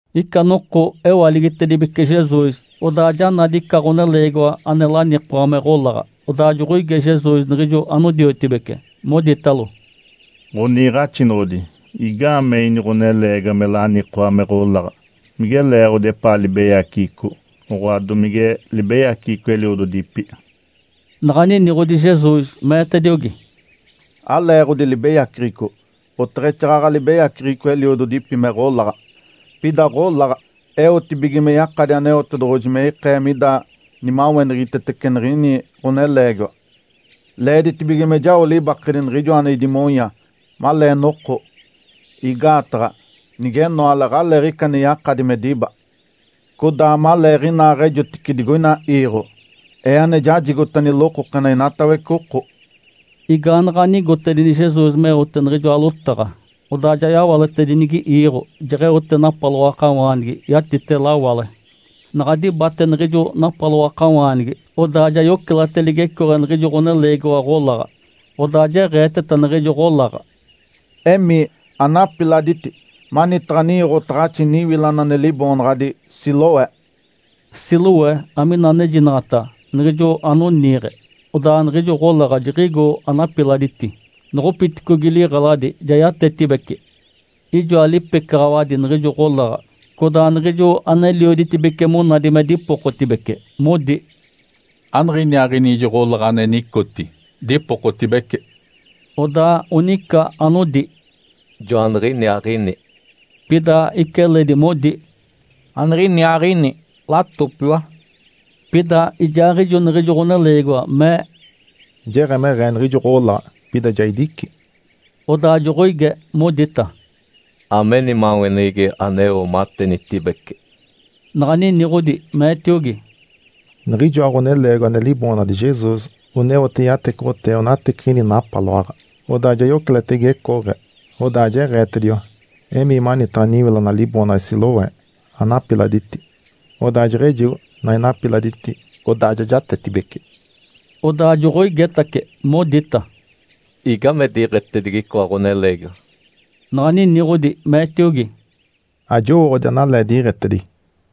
Ica noko ewaligitedibece Jesus, odaa ja nadi ica ɡ̶oneleegiwa ane lanikoa me ɡ̶olaɡ̶a. Odaa joɡ̶oige Jesus niɡ̶ijo anodiotibece, moditalo, “Ǥoniiɡ̶axinoɡ̶odi. Igaamee ini ɡ̶oneleegiwa me lanikoa me ɡ̶olaɡ̶a? Mige leeɡ̶odi epaa libeyaceɡ̶eco, oɡ̶oa domige libeyaceɡ̶eco eliododipi?” Naɡ̶a niniɡ̶odi Jesus, meetediogi, “Aleeɡ̶odi libeyaceɡ̶eco, oteɡ̶exaaɡ̶aɡ̶a libeyaceɡ̶eco eliododipi me ɡ̶olaɡ̶a. Pida ɡ̶olaɡ̶a eotibige me yakadi Aneotedoɡ̶oji me ikee mida nimaweneɡ̶egitetece niɡ̶ini ɡ̶oneleegiwa. Leeditibige me jao libakedi Niɡ̶ijoa ane idimonya, malee noko. Igaataɡ̶a nigenoale aɡ̶aleeɡ̶ica ane yakadi me diba. Codaa maleeɡ̶inaaɡ̶ejotice digoina iiɡ̶o, Ee ane jajigota nilokokena inatawece oko”. Igaanaɡ̶a nigotedini Jesus meote niɡ̶ijoa lotaɡ̶a, odaa ja yawaletedinigi iiɡ̶o, jeɡ̶eote napaloakawaanigi yatite lawale. Naɡ̶a dibate niɡ̶ijo napaloakawaanigi, odaa ja yocelate ligecooɡ̶e niɡ̶ijo ɡ̶oneleegiwa ɡ̶olaɡ̶a. Odaa jeɡ̶eeteta niɡ̶ijo ɡ̶olaɡ̶a, “Emii, anapiladiti manitaɡ̶a ninyoɡ̶otaɡ̶axi niwilana ane liboonaɡ̶adi Siloé”. (“Siloé” amina anejinaɡ̶ata “Niɡ̶ijo anoniiɡ̶e”). Odaa niɡ̶ijo ɡ̶olaɡ̶a jiɡ̶igo, anapiladiti. Noɡ̶opiticogi liɡ̶eladi, ja yatetibece. Ijoa lipecaɡ̶awadi niɡ̶ijo ɡ̶olaɡ̶a, codaa niɡ̶ijo anelioditibece monadi me dipokotibece, modi, “Aniɡ̶iniaaɡ̶ini ijo ɡ̶olaɡ̶a ane nicoti, dipokotibece?” Odaa onica anodi, “Joaniɡ̶iniaaɡ̶ini”. Pida ica eledi modi, “Aniɡ̶iniaaɡ̶ini, latopiwa”. Pida ijaaɡ̶ijo niɡ̶ijo ɡ̶oneleegiwa mee, “Jeɡ̶emeɡ̶ee niɡ̶ijo ɡ̶olaɡ̶a, pida ja idici”. Odaa joɡ̶oige, modita, “Ame nimaweneɡ̶egi aneo matenitibece?” Naɡ̶a niniɡ̶odi, meetiogi, “Niɡ̶ijoa ɡ̶oneleegiwa ane liboonaɡ̶adi Jesus oneote yatecoɡ̶otee onateciɡ̶ini napaloaɡ̶a, odaa ja yocelate igecooɡ̶e, odaa jeɡ̶eetediwa, ‘Emii manitaɡ̶a niwilana liboonaɡ̶adi Siloé, anapiladiti’. Odaa jeɡ̶ejigo, naɡ̶a inapiladiti, odaa ja jatetibece”. Odaa joɡ̶oigetace, modita, “Igame diɡ̶etedigi icoa ɡ̶oneleegiwa?” Naɡ̶a niniɡ̶odi, meetiogi, “Ajowooɡ̶odi analee diɡ̶etedigi”.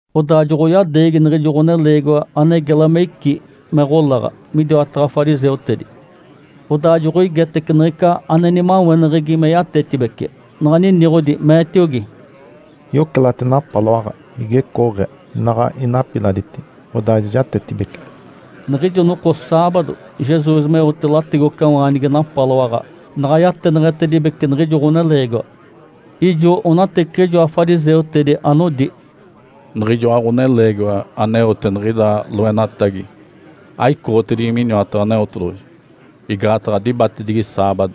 Odaa joɡ̶oyadeegi niɡ̶ijo ɡ̶oneleegiwa ane gela me icí me ɡ̶olaɡ̶a midiwataɡ̶a fariseutedi. Odaa joɡ̶oigetece niɡ̶ica ane nimaweneɡ̶egi me yatetibece. Naɡ̶a niniɡ̶odi, meetiogi, “Yocelate napaloaɡ̶a igecooɡ̶e. Naɡ̶a inapiladiti, odaa ja jatetibece”. Niɡ̶ijo noko saabado Jesus meote lategocawaanigi napaloaɡ̶a, naɡ̶a yateneɡ̶etedibece niɡ̶ijo ɡ̶oneleegiwa. Ijo onateciɡ̶ijoa fariseutedi anodi, “Niɡ̶ijoa ɡ̶oneleegiwa aneote niɡ̶ida loenatagi aicoɡ̶otedigi miniwataɡ̶a Aneotedoɡ̶oji, igaataɡ̶a dibatedigi saabado”.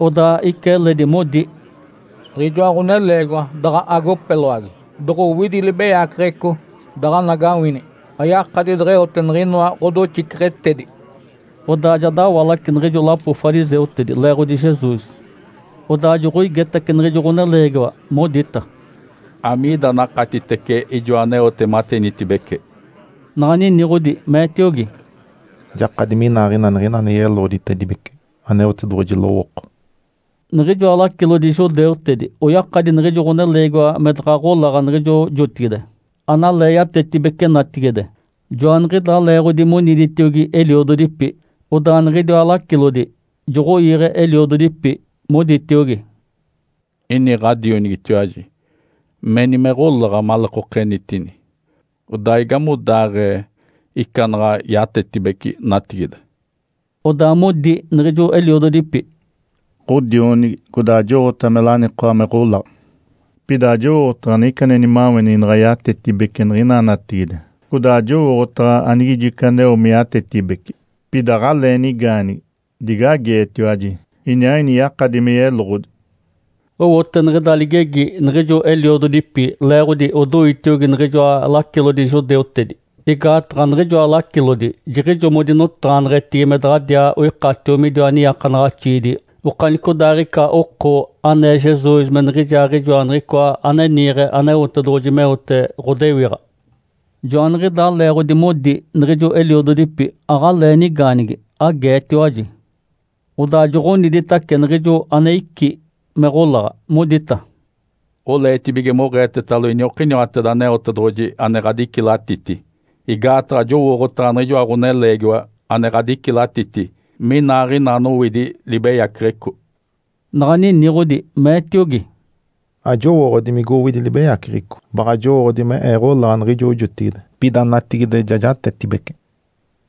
Odaa ica eledi modi, “Niɡ̶ijoa ɡ̶oneleegiwa daɡ̶a agopeloagi doɡ̶owidi libeyaceɡ̶eco daɡ̶anagawini ayakadi deɡ̶eote niɡ̶inoa ɡ̶odoxiceɡ̶etedi.” Odaa ja dawalace niɡ̶ijo lapo fariseutedi, leeɡ̶odi Jesus. Odaa joɡ̶oigetace niɡ̶ijo ɡ̶oneleegiwa, modita, “Amiida anakatitece ijoa aneote matenitibece?” Naɡ̶a niniɡ̶odi, meetiogi, “Jakadi minaaɡ̶ina niɡ̶ina ane yeloɡ̶oditedibece Aneotedoɡ̶oji lowooko”. Niɡ̶ijoa lacilodi judeutedi oyakadi niɡ̶ijo ɡ̶oneleegiwa me daɡ̶a ɡ̶olaɡ̶a niɡ̶ijo jotigide, analee yatetibece natigide. Joaniɡ̶idaa leeɡ̶odi moniditiogi eliododipi. Odaa niɡ̶idiwa lacilodi joɡ̶oige eliododipi, moditiogi, “Ini ɡ̶adionigitiwaji? Meni me ɡ̶olaɡ̶a maleekenitini. Odaa igamodaaɡ̶ee ica naɡ̶a yatetibece natigide?” Odaa modi niɡ̶ijo eliododipi, “Ǥodionigi, codaa jowooɡ̶otaɡ̶a me lanikoa me ɡ̶olaɡ̶a. Pida ajowooɡ̶otaɡ̶a niɡ̶ica ane nimaweneɡ̶egi naɡ̶a yatetibece niɡ̶ina natigide, codaa ajowooɡ̶otaɡ̶a anigijo ica aneo me yatetibece. Pida aɡ̶alee nigaanigi. Dige ageetiwaji. Iniaaɡ̶ini yakadi me yeloɡ̶odi”. Owote niɡ̶ida ligegi niɡ̶ijo eliododipi leeɡ̶odi odoitiogi niɡ̶ijoa lacilodi judeutedi. Igaataɡ̶a niɡ̶ijoa lacilodi jiɡ̶ijo modinotaɡ̶aneɡ̶etigi me daɡ̶adiaa oikatio midiwa niiakanaɡ̶axiidi okanicodaaɡ̶ica oko anee Jesus me niɡ̶ijaaɡ̶ijoa Niɡ̶icoa ane niiɡ̶e Aneotedoɡ̶oji meote ɡ̶odewiɡ̶a. Joaniɡ̶idaa leeɡ̶odi modi niɡ̶ijo eliododipi, “Aɡ̶alee nigaanigi. Ageetiwaji”. Odaa joɡ̶oniditace niɡ̶ijo ane icí me ɡ̶olaɡ̶a, modita, “Oleetibige moɡ̶eetetalo iniokiniwateda Aneotedoɡ̶oji ane ɡ̶adicilatiti. Igaataɡ̶a jowooɡ̶otaɡ̶a niɡ̶ijoa ɡ̶oneleegiwa ane ɡ̶adicilatiti minaaɡ̶ina anowidi libeyaceɡ̶eco”. Naɡ̶a niniɡ̶odi, meetiogi, “Ajowooɡ̶odi migowidi libeyaceɡ̶eco. Baɡ̶a jowooɡ̶odi me ee ɡ̶olaɡ̶a niɡ̶ijo jotigide, pida natigide ja jatetibece”.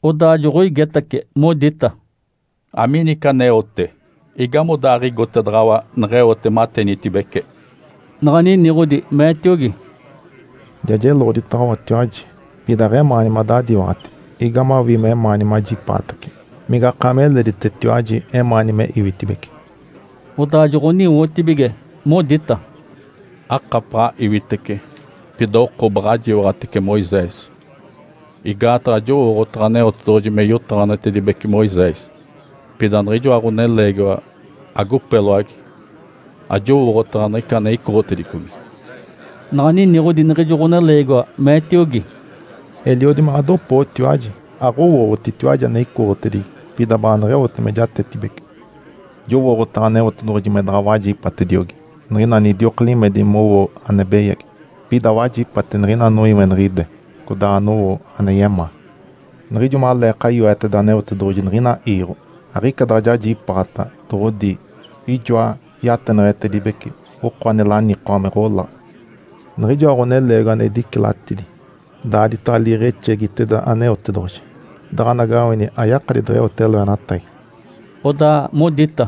Odaa joɡ̶oigetace, modita, “Amiini ica aneote? Igamodaaɡ̶igotedaɡ̶awa neɡ̶eote matenitibece?” Naɡ̶a niniɡ̶odi, meetiogi, “Ja jeloɡ̶oditaɡ̶awatiwaji, pida aɡ̶emaani madadiwaɡ̶ati. Igamawii memaani majipaatace? Migakaami eleditetiwaji emaani me iwitibece?” Odaa joɡ̶oniwotibige modita, “Akapaɡ̶a iwitece. Pida oko, baɡ̶a jiwaɡ̶atece Moisés. Igaataɡ̶a jowooɡ̶otaɡ̶a Aneotedoɡ̶oji me yotaɡ̶aneɡ̶etedibece Moisés. Pida niɡ̶ijoa ɡ̶oneleegiwa agopeloagi ajowooɡ̶otaɡ̶a niɡ̶ica ane icoɡ̶otedicogi”. Naɡ̶a niniɡ̶odi niɡ̶ijo ɡ̶oneleegiwa, meetiogi, “Eliodi me ɡ̶adopootiwaji! Aɡ̶owooɡ̶otitiwaji ane icoɡ̶otedigi, pida baaneɡ̶eote me jatetibece. Jowooɡ̶otaɡ̶a Aneotedoɡ̶oji me daɡ̶a wajipatediogi niɡ̶ina anidioka limedi mowo ane beyagi. Pida wajipate niɡ̶ina anoiweniɡ̶ide, codaa anowo ane yemaa. Niɡ̶ijo maleeka yoeteda Aneotedoɡ̶oji niɡ̶ina iiɡ̶o, aɡ̶ica daɡ̶a jajipaaɡ̶ata doɡ̶odi ijoa yateneɡ̶etedibece oko ane lanikoa me ɡ̶olaɡ̶a. Niɡ̶ijoa ɡ̶oneleegiwa ane idicilatidi daaditaɡ̶a liiɡ̶exegiteda Aneotedoɡ̶oji, daɡ̶anagawini ayakadi deɡ̶eote loenatagi”. Odaa modita,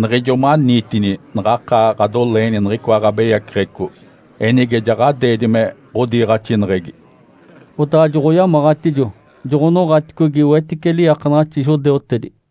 “Niɡ̶ijo maniitini naɡ̶akaa ɡ̶adoleeni niɡ̶icoa ɡ̶abeyaceɡ̶eco. Enige ja ɡ̶adeedi me ɡ̶odiiɡ̶axineɡ̶egi?” Odaa joɡ̶oyamaɡ̶atijo, joɡ̶onoɡ̶aticogi wetice liiakanaɡ̶axi judeutedi.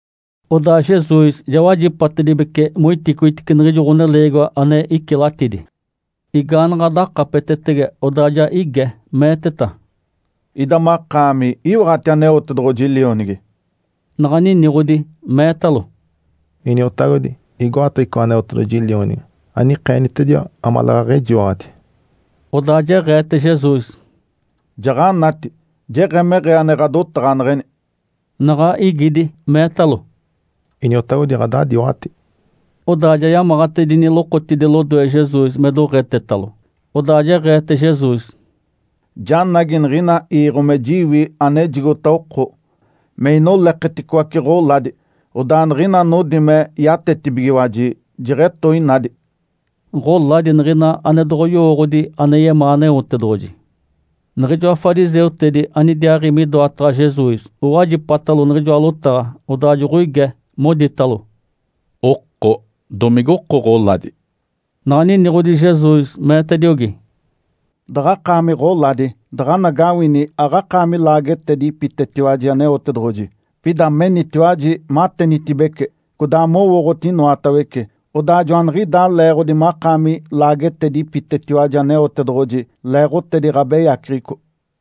Odaa Jesus ja wajipatedibece moiticoitice niɡ̶ijo ɡ̶oneleegiwa ane icilatidi. Igaanaɡ̶a dakapetetege, odaa ja ige, meeteta, “Ida makaami iwaɡ̶ati Aneotedoɡ̶oji Lionigi?” Naɡ̶a niniɡ̶odi, meetalo, “Iniotagodi. Igoataɡ̶a icoa Aneotedoɡ̶oji Lionigi anikeenitediwa amaleeɡ̶aɡ̶a ejiwaɡ̶adi?” Odaa jeɡ̶eete Jesus, “Jaɡ̶anati. Jeɡ̶emeɡ̶ee ane ɡ̶adotaɡ̶aneɡ̶eni”. Naɡ̶a igidi, meetalo, “Iniotagodi, ɡ̶adadiwaɡ̶ati”. Odaa ja yamaɡ̶atedini lokotidi lodoe Jesus me doɡ̶etetalo. Odaa jeɡ̶eete Jesus, “Janagi niɡ̶ina iiɡ̶o me jiwi anejigota oko, me inoleketicoace ɡ̶oladi, odaa niɡ̶ina anodi me yatetibigiwaji jeɡ̶etoinadi”. (Ǥoladi niɡ̶ina ane doɡ̶oyowooɡ̶odi ane yemaa Aneotedoɡ̶oji.) Niɡ̶ijoa fariseutedi anidiaaɡ̶i midoataɡ̶a Jesus owajipatalo niɡ̶ijoa lotaɡ̶a. Odaa joɡ̶oige, moditalo, “Oko domigoko ɡ̶oladi?” Naɡ̶a niniɡ̶odi Jesus, meetediogi, “Daɡ̶akaami ɡ̶oladi, daɡ̶anagawini aɡ̶akaami laagetedipitetiwaji Aneotedoɡ̶oji. Pida menitiwaji matenitibece, codaa mowooɡ̶oti inoatawece. Odaa joaniɡ̶idaa leeɡ̶odi makaami laagetedipitetiwaji Aneotedoɡ̶oji leeɡ̶otedi ɡ̶abeyaceɡ̶eco”.